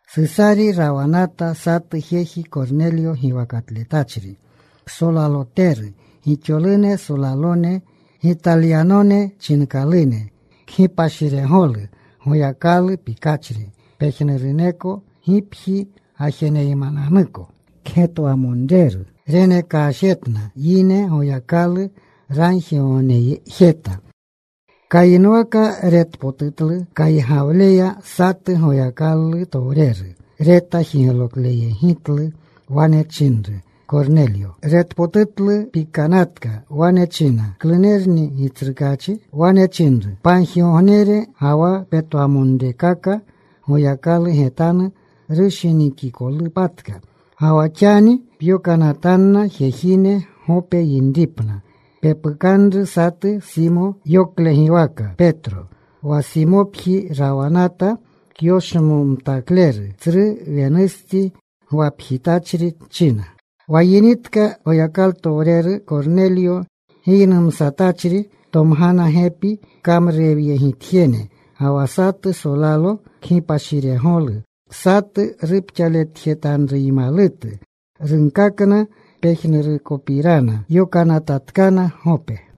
Susari rawanata satu jeji Kornelyo giwakatletachri, ksolaloteru gixolune solalone Gitalyanone chinkalune. Kgipashiregolu. Goyakalu pikachri pejnuruneko gipji gajeneymananuko. Kgetwamonreru. Renekashjetna yine. Goyakalu ragjigognejeta. Kayinwaka retpotutlu kaygawleya satu Goyakalu towreru. Reta jiglokleyegitlu. Wane chinru, “Kornelyo.” Retpotutlu. Pikanatka. Wane china, “¿Klunerni, Gitsrukaachi?” Wane chinru, “Pagjigognere ga wa petwamonrekaka Goyakalu getanu rushinikikolpatka. Ga wa xani pyokanatanna jejine Gope yinripna. Pepukanru satu Simo. Yoklegiwaka Petro. Wa Simopji rawanata, kyoshmomtakleru. Tsru wenustsi gwapjitachri,” china. Wa yinitka Goyakalutowreru Kornelyo giynumsatachri. Tomgana gepi kamrurewyegitjene, ga wa satu solalo kgipashiregolu, satu rupxaletjetanruymalutu. Runkakna pejnurukopirana. Yokanatatkana Gope.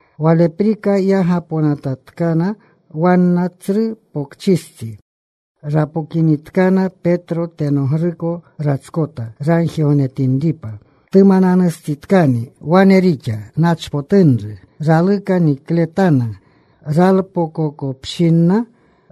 Waleprika yagaponatatkana wanna. Tsru pokchistsi rapokinitkana, Petro tenogruko ratskota, ragjigognetinripa. Tumananustsitkani. Wane rixa. Nachpotunru. Raluka nikletana. Ralpokokopshinna,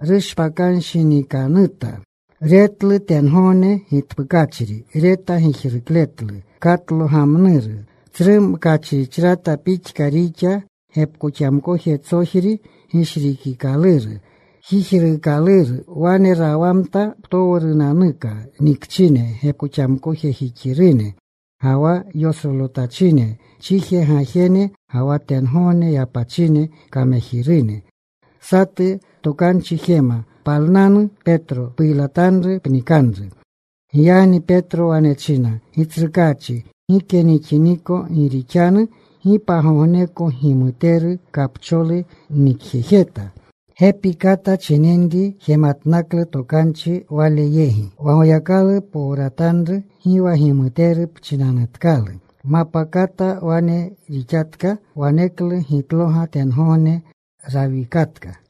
rushpakanshinikanuta. Retlu tengogne gitpukachri. Reta gijrukletlu katlogamnuru. Tsru mkachrichrata pixka rixa. Gepkoxamkojetsojri gishrikikaluru. Jijruukaluru. Wane rawamtna ptowrunanuka nikchine gepkoxamkojejixirune, ga wa yosrolotachine chiji gajene, ga wa tengogne yapachine kamejirune. Satu tokanchi jema, “Palnanu, Petro. Puylatanru. Pnikanru.” Giyagni Petro wane china, “Gitsrukaachi, gike nixiniko. Gi rixanu gi pagogneko gimuteru, kapcholu nnikjejeta.” Gepi kata chininri jematnaklu tokanchi wale yegi: “Wa Goyakalu powratanru gi wa gimuteru pchinanutkalu.” Mapkata wane rixatka. Waneklu gitloga tengogne rawikatka.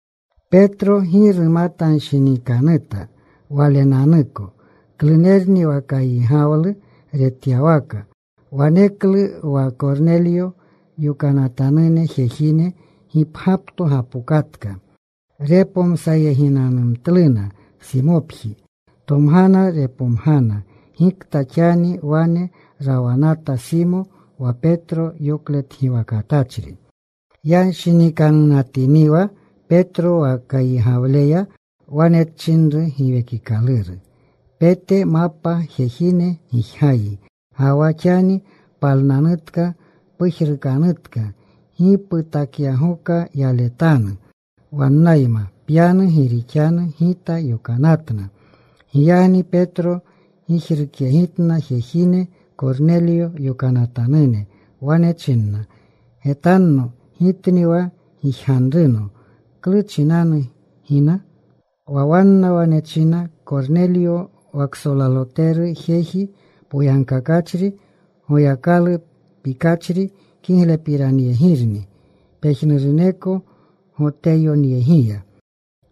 Petro gi rumatanshinikanunata walenanuko klunerni wa kaygawlu retyawaka. Waneklu wa Kornelyo yokanatanune jejine gipgyapto gapokatka. Repomsayeginanumtluna Simopji. Tomgana. Repomgana gikta xani wane rawanata Simo wa Petro yokletgiwakatletachri. Yanshinikanunatiniwa Petro wa kaygawleya, wane chinru Giwekikaluru, “Pete. Mapa jejine gijgayi. Ga wa xani palnanutka. Pujrukanutka. Gi putakyagoka yaletanu. Wannayma pyanu. Gi rixanu Gita yokanatna.” Giyagni Petro gijrukyegitna jejine Kornelyo yokanatanune. Wane china, “Getanno. Gitni wa gijganruno. ¿Klu chinanu gina?” Wa wanna wane china, “Kornelyo wa ksolaloteru, jeji poyagkakachri, Goyakalu pikachri, kiglepiranyegirni pejnuruneko Goteyoneyegiya.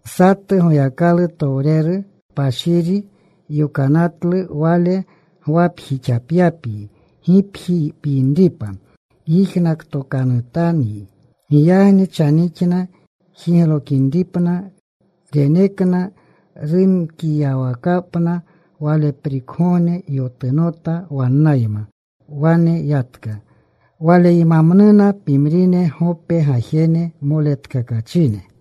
Satu Goyakalutowreru kpashiri yokanatlu wale gwapjixapyapyi, gipji pyinripa. Yijnakotokanutanyi.” Giyagni chanixna jiglokinripna. Renekna rumkiyawakapna. Waleprikgogne yotunota. Wannayma wane yatka. Waleymamnuna pimrine Gope gajene moletkakachine.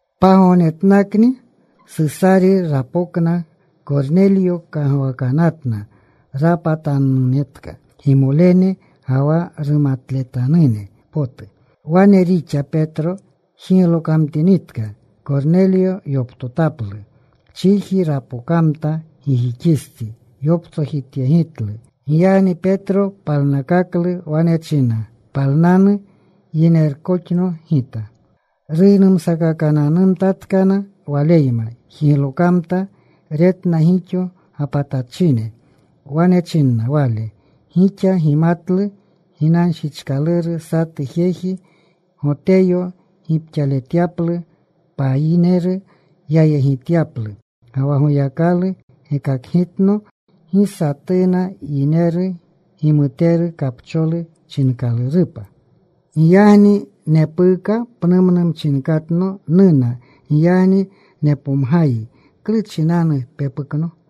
Pagognetnakni Susari rapokna. Kornelyo kagwakanatna. Rapatanunetka gimolene ga wa rumatletanune potu. Wane rixa. Petro jiglokamtinitka, Kornelyo yoptotaplu. Chiji rapokamta gijixistsi. Yoptsojityegitlu. Giyagni Petro palnakaklu. Wane china, “Palnanu. Yinerkoxno gita.” Ruynumsakakamtatkana waleyma. Jiglokamta. Retna gixo gapatanatachine. Wane chinna wale, “Gixa gimatlu ginanshichkaluru satu jeji Goteyo gipxaletyaplu payineru, yayegityaplu. Ga wa Goyakalu gekakgitno gi satuna yineru gimuteru, kapcholu chinkalurupa. Giyagni nepuuka pnumnu mchinkatno nuna. Giyagni nepomgayi, ¿klu chinanu pepukno?”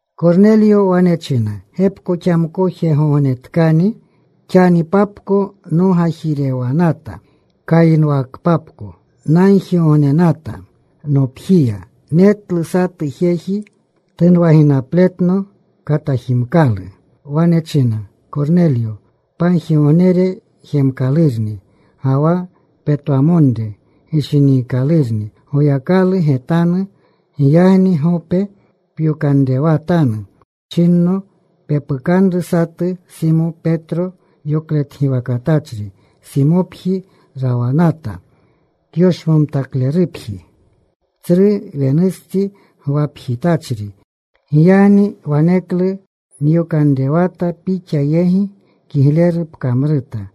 Kornelyo wane china, “Gepkoxamkojegognetkani xanipapko nogajirewanata. Kayinwakpapko nagjigognenata nopjiya. Netlu satu jeji. Tunwaginapletno. Katajimkalu. Wane china, ‘Kornelyo, pagjigognere jemkalurni, ga wa petwamonre gishiniikalurni Goyakalu getanu. Giyagni Gope pyokanrewatanu,’ chinno. ‘Pepukanru satu Simo, Petro yokletgiwakatletachri. Simopji rawanata, kyoshmomtaklerupji, tsru wenustsi gwapjitachri.’ Giyagni waneklu nyokanrewata pixa yegi. Kigleru pkamruta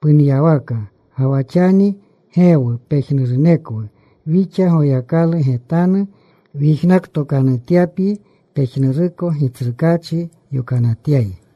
punyawaka. Ga wa xani geewu pejnurunekwu wixa Goyakalu getanu, wyijnakotyapyi pejnuruko Gitsrukaachi yokanatyayi.”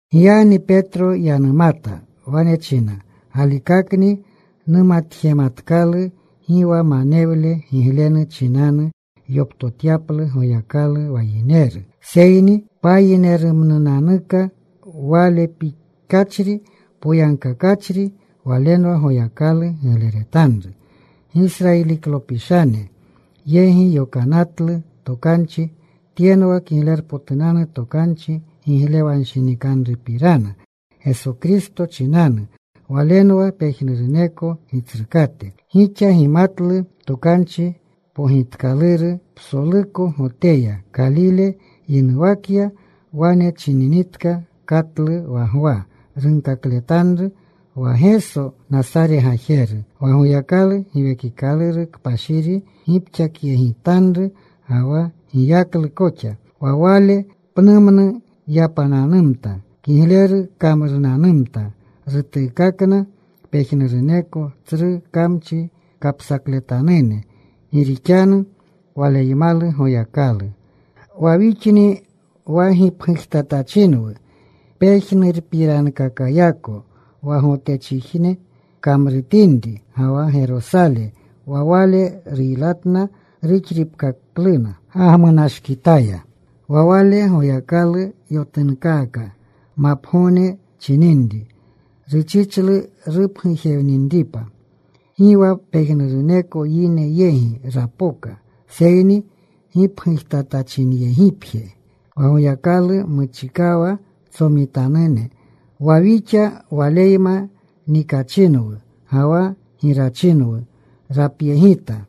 Giyagni Petro yanumata. Wane china, “Galikakni numatjematkalu gi wa manewle giglenu chinanu yoptotyaplu Goyakalu wa yineru. Seyni payinerumnunanuka Wale pikachri, poyagkakachri, walenwa Goyakalu gigleretanru. Gisrayilineklopishane yegi yokanatlu tokanchi. Tyenwa Kiglerpotunanu Tokanchi giglewanshinikanrupirana Geso Kristo chinanu. Walenwa pejnuruneko Gitsrukate. Gixa gimatlu tokanchi pogitkaluru psoluko Goteya. Kalile yinuwakya. Wane chininitka katlu wa Gwa runkakletanru. Wa Geso, Nasare gajeru, wa Goyakalu Giwekikaluru Kpashiri gipkakyegitanru, ga wa giyaklu koxa. Wa Wale pnumnu yapananumta. Kigleru kamrunanumta: rutuukakna pejnuruneko tsru kamchi kapsakletanune, gi rixanu Waleymalu Goyakalu. “Wa wixni wa gipgujtatachinwu pejnurupirankakayako wa Gotechijne kamrutinri ga wa Gerosale. Wa Wale ruylatna. Ruxripkakluna gagmunashkitaya. Wa Wale Goyakalu yotunkaka mapgogne chininri. Ruchichlu rupgujewninripa. Gi wa pejnuruneko yine yegi rapoka, seyni gipgujtatachinyegipje, wa Goyakalu muchikawa tsomitanune, wa wixa Waleyma nikachinwu ga wa girachinwu rapyegita,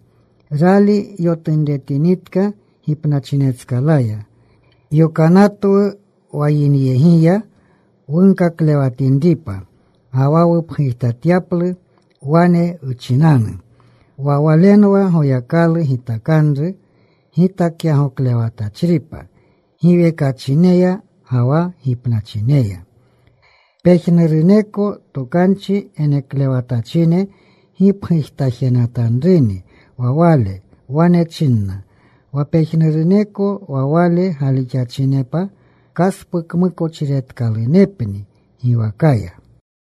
rali yotunremtinitka gipnachinetskalaya. Yokanatwu wa yinyegiya wunkaklewatinripa ga wa wupgujtatyaplu; wane wchinanu wa Walenwa Goyakalu gitakanru gitakyagoklewatachripa giwekachineya ga wa gipnachineya. Pejnuruneko tokanchi geneklewatachine gipgujtajenatanruni wa Wale. Wane chinna wa pejnuruneko wa Wale galixachinepa kaspukmukochiretkalunepni giwakaya.”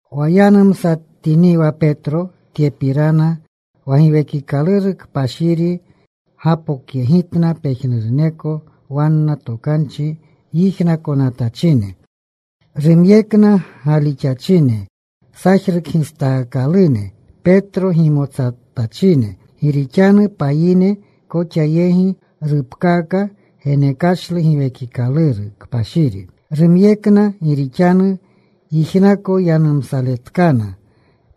Wa yanumsatiniwa Petro tyepirana, wa Giwekikaluru Kpashiri gapokyegitna pejnuruneko wanna tokanchi yijnakonatachine. Rumyekna galixachine sajrukgistaakalune Petro gimotsatachine gi rixanu payine koxa yegi rupkaaka genekashlu Giwekikaluru Kpashiri. Rumyekna gi rixanu yijnako yanumsaletkana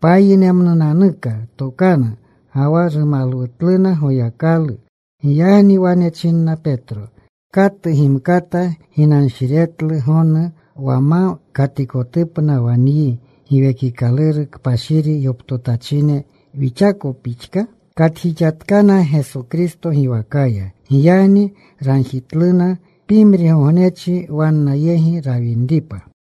payinerunemnuka tokanu ga wa rumalwutluna Goyakalu. Giyagni wane china Petro. “¿Katu gimkata ginanshiretlu gonu wa ma katikotupna wa nyi Giwekikaluru Kpashiri yoptotachine wixako pixka?” Katjixatkana Geso Kristo giwakaya. Giyagni ragjitluna pimrigognechi wanna yegi rawinripa.